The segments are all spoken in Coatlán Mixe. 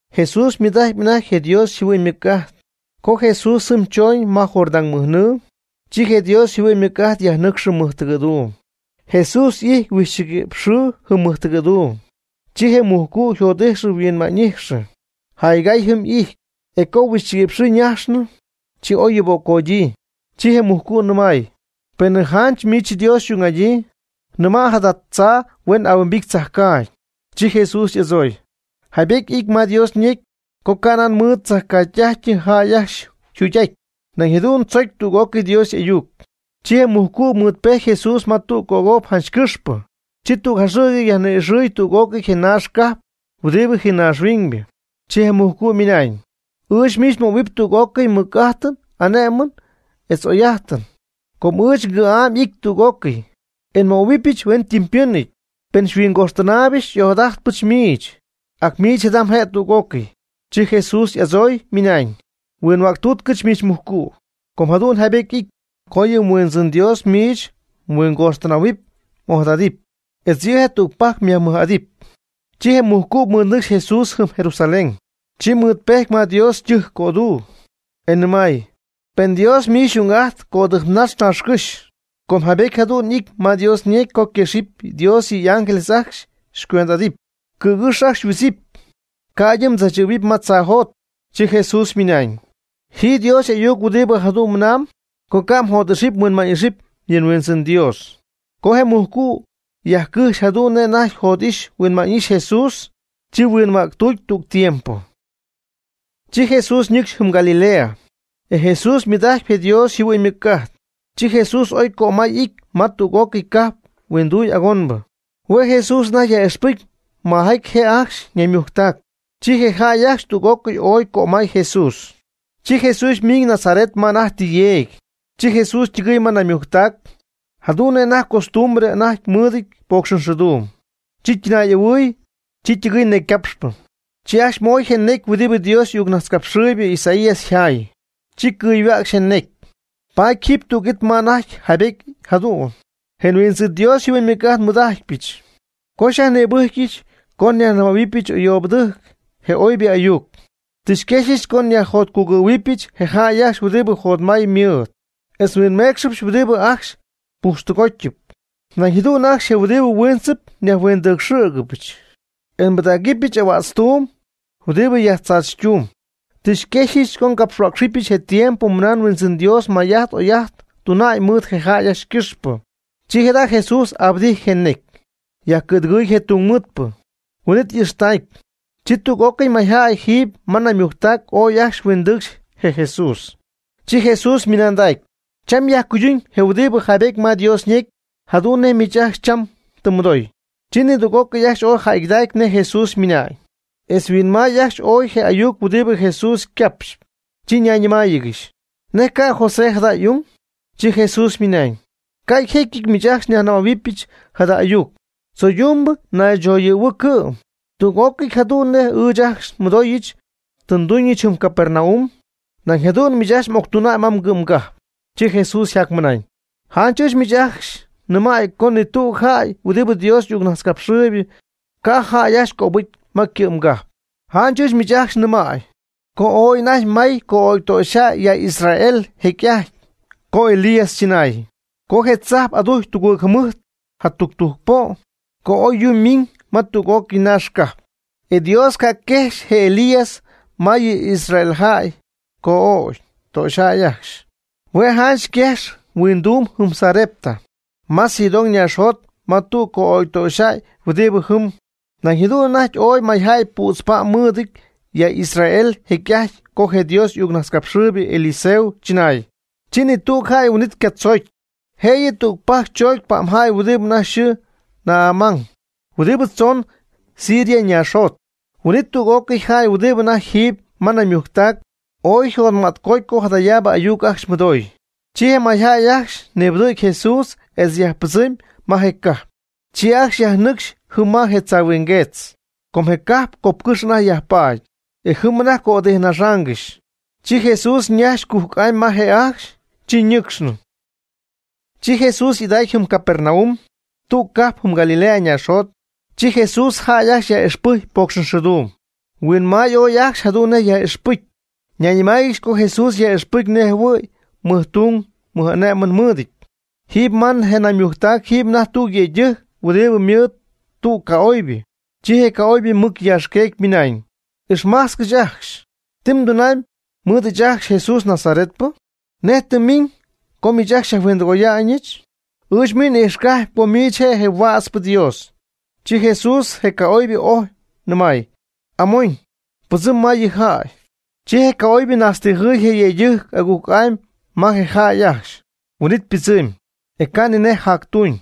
Jesús ymɨɨd'ajtpy anajty je Dios yjɨhuɨ'ñ ymɨc'ajt. Co Jesús jɨm choñ ma Jordán mɨj nɨɨ, chi je Dios yjɨhuɨ'ñ ymɨc'ajt yajnɨcxɨ mɨjtɨgɨ̈duum. Jesús y'ijty huixchɨgui'px xɨɨ jɨm mɨjtɨgɨ̈duum. Chi je mujcu' yjot'ijxɨ huinma'ñ'ijxɨ. Jaygay jɨm y'ijty, e co huixchɨgui'px xɨɨ ñajxnɨ, chi oy yuuböccodyii. Chi je mujcu' nɨmay: ―Penɨ janch miich Dios xy'ung'adyii, nɨmay jada tzaa huen ahuimbity tzajcaagy. Chi Jesús y'adzooy: ―Jaybety ity ma Dios ñecy co ca'nan mɨɨd tzajcaagy tɨ'ajty jäy ajcxy yjugy'aty, nañ jadu'n tzocy tüg'ócɨy Dios y'ayuc. Chi je mujcu' mɨɨdpejty Jesús ma tüg cop janch cɨxpɨ, chi tüg jaxɨ̈gy yajni'ixɨɨy tüg'ócɨy je naax cajp huɨdi jii naaxhuiñbɨ. Chi je mujcu' ymɨnañ: ―Ɨɨch miich möhuɨpy tüg'ócɨy mɨc'ájtɨn ané'mɨn etz oy'ájtɨn, com ɨɨch ngɨ̈'am y'ity tüg'ócɨy, e nmöhuɨbɨch hueñytɨmpɨ̈nɨty. Pen xyhuingoxtɨnaaybɨch xy'ojadajtpɨch miich, ac miich jada mje' tüg'ócɨy. Chi Jesús y'adzooy, ymɨnañ: ―Huinhuägtuutcɨch miich mujcu', com jadu'n jaybéty y'ity: “Co yɨ Huindzɨn miich mDios mhuingoxtɨnähuɨpy m'ojadadɨpy, etz yɨ' je' tüg pajc myajmɨj'adɨpy.” Chi je mujcu' mɨɨdnɨcxy Jesús jɨm Jerusalén, chi mɨɨd pejty ma Dios ytɨjc coduu, e nɨmay: ―Pen Dios miich xy'ung'ajtp cödɨjpnax naaxcɨ́xy, com jaybety jadu'n y'ity ma Dios ñecy co quexɨpy Dios yɨ' y'ángeles ajcxy e xycuend'adɨpy. Cɨ̈gɨ́xy ajcxy xyhuidzɨpy, ca'ydɨ mdzaachɨ̈y ma tzaajot. Chi Jesús ymɨnañ: ―Ji Dios y'ayuc huɨdi jadu'n mɨnam co ca' mjot'ixɨpy mhuinma'ñ'ixɨpy yɨ mHuindzɨn Dios. Co je mujcu' yajcɨjxy jadu'n nej anajty jot'ixa'ñ huinma'ñ'ixa'ñ Jesús, chi huinhuägtuuty tüg tiempo. Chi Jesús nɨcxy jɨm Galilea, e Jesús mɨɨd'ajtpy je Dios yjɨhuɨ'ñ ymɨc'ajt. Chi Jesús ooy cömay y'ijty ma tüg'ócɨy cajp huinduy agonbɨ. Hue' Jesús anajty yaj'ixpɨcy majaty je' ajcxy naymujctac. Chi je jäy ajcxy tüg'ócɨy ooy cömay Jesús. Chi Jesús ymiiñ Nazaret ma anajty tɨ yeegy. Chi Jesús ytɨgɨy ma naymujctac, jadu'n nej costumbre anajty mɨɨdɨty pocxxɨɨduum. Chi ytɨnaay'ahuɨy, chi ytɨgɨɨy necycapxpɨ. Chi ajcxy mooy je necy huɨdibɨ je Dios y'ayucnajtzcapxɨɨybɨ Isaías yjaay. Chi cɨyhuäcxy je necy, paty jiiby tüg it ma anajty yjaybétyɨty jadu'n: Je Huindzɨn Dios yjɨhuɨ'ñ ymɨc'ajt xymɨɨd'ajtpɨch, co xyajnïbɨcyɨch co nyajnɨmähuɨbɨch ayoobɨtɨjc je oybɨ ayuc. Tɨ xyquexyɨch co nyajjotcugɨ̈huɨbɨch je jäy ajcxy huɨdi jotmay ymɨɨd, etz nhuinméecxɨbɨch huɨdibɨ ajcxy pujxtɨgótyɨp, nañ jadu'n ajcxy je huɨdibɨ huiintzɨp nyajhuindɨɨcxɨ̈gɨbɨch, e nbɨdägɨbɨch ahuätztuum huɨdibɨ yajtzaachytumb. Tɨ xyquexyɨch co ngapxhuäcxɨbɨch je tiempo mɨna Huindzɨn Dios may'ajt oy'ajt tuna'ñ mɨɨd je jäy ajcxy ycɨxpɨ. Chi jada' Jesús abɨdijty je ñecy, yajcɨ̈dɨgɨɨy je tungmɨɨdpɨ, huin'it y'ixtacy. Chi tüg'ócɨy mayjäy jiiby ma naymujctac ooy ajcxy huindɨcxy je Jesús. Chi Jesús ymɨnandacy: ―Cham yajcuydun je' huɨdi jaybety ma Dios ñecy jadu'n nej miich ajcxy cham tɨ mmɨdooy. Chi nidüg'ócɨy ajcxy ooy jäygɨdacy nej Jesús mɨna'ñ, etz huinmay ajcxy ooy je ayuc huɨdibɨ Jesús ycapxy, chi ñayñɨmáayɨgɨxy: ―¿Nej ca'y José jada jada' y'ung? Chi Jesús ymɨnaañ: ―Ca' yjécyɨty miich ajcxy xyajnɨmähuɨbɨch jada ayuc: “Tzoydumbɨ naychoyɨ̈huɨɨ cɨ'm. Tüg'ócɨy jadu'n nej ɨɨch ajcxy nmɨdooyɨch tɨ mduñ jɨm Capernaum, nañ jadu'n miich octun ma mgɨ'mgajp.” Chi Jesús yjacmɨnañ: ―Janch ɨɨch miich ajcxy nnɨmäy co ni tüg jäy huɨdibɨ Dios y'ayucnajtzcapxɨɨyb ca' jäy ajcxy cöbɨcy ma ycɨ'mgajp. Janch ɨɨch miich ajcxy nɨmäy co ooy anajty may co'ögy ytöxyjäy ya Israel jecy'ajty co Elías chɨnaay, co je tzajp adujcy tugɨɨg jɨmɨjt jatudujc po', co oy yuu miiñ ma tüg'ócɨy naax cajp. E Dios ca' quejxy je Elías ma yɨ Israeljäy co'ögy töxyjäy ajcxy. Hue' janch quejxy huinduum jɨm Sarepta ma Sidón naaxjot ma tüg co'ögy töxyjäy huɨdi jɨm. Nañ jadu'n anajty ooy mayjäy püdz pa'm mɨɨdɨty ya Israel jecy'ajty co je Dios y'ayucnajtzcapxɨɨybɨ Eliseo chɨnay. Chi ni tüg jäy huin'it catzoocy, jëyɨ tügpajc choocy pa'mjäy huɨdibɨ anajty yxɨɨ Naamán huɨdi tzoon Siria naaxjot. Huin'it tüg'ócɨy jäy huɨdi anajty jiiby ma naymujctac ooy yjotma'tcoty co jadayaab ayuc ajcxy mɨdooy. Chi je mayjäy ajcxy nibɨdɨ̈gy Jesús etz yajpɨdzɨmy ma je cajp. Chi ajcxy yajnɨcxy jɨm ma je tzaahuingueetz, co je cajp copcɨ́xy anajty yajpaady, e jɨm anajty cödɨjpnaxaangɨxy. Chi Jesús ñajxy cujc'amy ma je' ajcxy, chi ñɨcxnɨ. Chi Jesús y'idacy jɨm Capernaum, tüg cajp jɨm Galilea naaxjot, chi Jesús jäy ajcxy yaj'ixpɨjcy pocxxɨɨduum. Huinmay ooy ajcxy jadu'n nej je' yaj'ixpɨcy. Ñayñɨmáayɨgɨxy co je Jesús yaj'ixpɨcy nejɨhuɨ̈y mɨjtung mɨj'ané'mɨn mɨ́ɨdɨty. Jiiby ma je naymujctac jiiby anajty tüg yëydɨjc huɨdibɨ mɨɨd tüg ca'oybɨ, chi je ca'oybɨ mɨc yaaxqueecy ymɨnañ: ―Ixmajtzcɨch ajcxy, ¿ti mdunamy mɨɨd ɨɨch ajcxy Jesús je nazaretpɨ? ¿Nej tɨ mmiñ co xyajhuindɨgoyáanɨgɨxyɨch? Ɨɨch miich n'ijxcapy co miich je' je Huätzpɨ Dios. Chi Jesús je ca'oybɨ ojy, nɨmay: ―Amon, pɨdzɨm ma yɨ jäy. Chi je ca'oybɨ najtztijɨɨy je yëydɨjc agujc'amy ma je jäy ajcxy, huin'it ypɨdzɨmy, e ca' ni nej jactuuñ.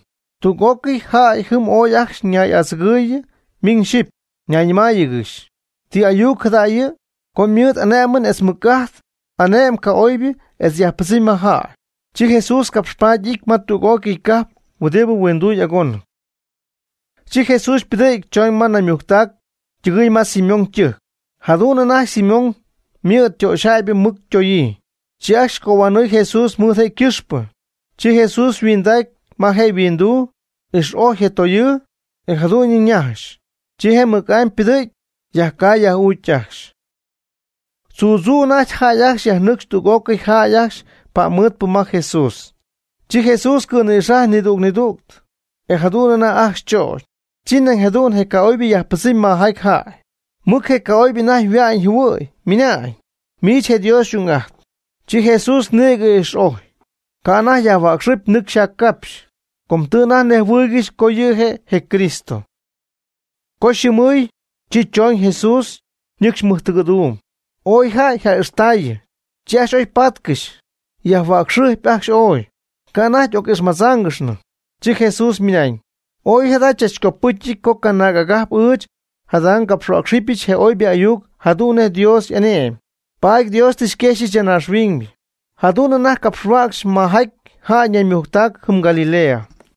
Tüg'ócɨy jäy jɨm ooy ajcxy ñay'adzɨgɨɨyɨ miñ xyɨpy yjanayñɨmáayɨgɨxy: ―¿Ti ayuc jada' yɨ'? Co mɨɨd y'ané'mɨn etz mɨc'ajt ane'my ca'oybɨ etz yajpɨdzɨmy ma jäy. Chi Jesús capxpaady y'ijty ma tüg'ócɨy cajp huɨdi huinduy agónɨp. Chi Jesús ypɨdɨ̈gy choñ ma naymujctac, ytɨgɨɨy ma Simón ytɨjc. Jadu'n anajty Simón ymɨ̈d töxyjäybɨ mɨc ytoyii. Chi ajcxy cohuanɨɨy Jesús mɨɨd je' ycɨxpɨ. Chi Jesús yhuindacy ma je' yhuinduu, ix'ojy je toyɨɨ, e jadu'ñɨ ñajxy. Chi je' mɨc'amy ypɨdɨ̈gy, yajcay yaj'uucy ajcxy. Tzuu tzuu anajty jäy ajcxy yajnɨcxy tüg'ócɨy jäy ajcxy pa'mmɨɨdpɨ ma Jesús. Chi Jesús cɨ̈nɨ̈xajy nidüg nidüg, e jadu'n anajty ajcxy chögy. Chi nañ jadu'n je' ca'oybɨ yajpɨdzɨmy ma mayjäy, mɨc je ca'oybɨ anajty yhua'ñ yjɨhuɨ̈y, ymɨna'ñ: ―Miich je' Dios xy'ung'ajtp. Chi Jesús nïgɨ ix'ojy, ca' anajty yajhuäcxɨpy nɨcxy yjaccapxy, com tɨ anajty nejhuɨɨygɨxy co yɨ' je' je Cristo. Co yxɨɨmɨɨy, chi chooñ Jesús, ñɨcxy mɨjtɨgɨ̈duum. Ooy jäy yja'ixtäyii, chi ajcxy oy paatcɨxy, yajhuäcxɨjpy ajcxy ooy, ca' anajty oc'ixmadzáangɨxnɨ. Chi Jesús ymɨnañ: ―Ooy jada chachcopɨ́cyɨty co canaag agajp ɨɨch jada ngapxhuäcxɨbɨch je oybɨ ayuc jadu'n nej Dios y'ane'my. Paady Dios tɨ xyquexyɨch ya naaxhuiñ. Jadu'n anajty je' capxhuäcxy majaty jäy ñaymujctac jɨm Galilea.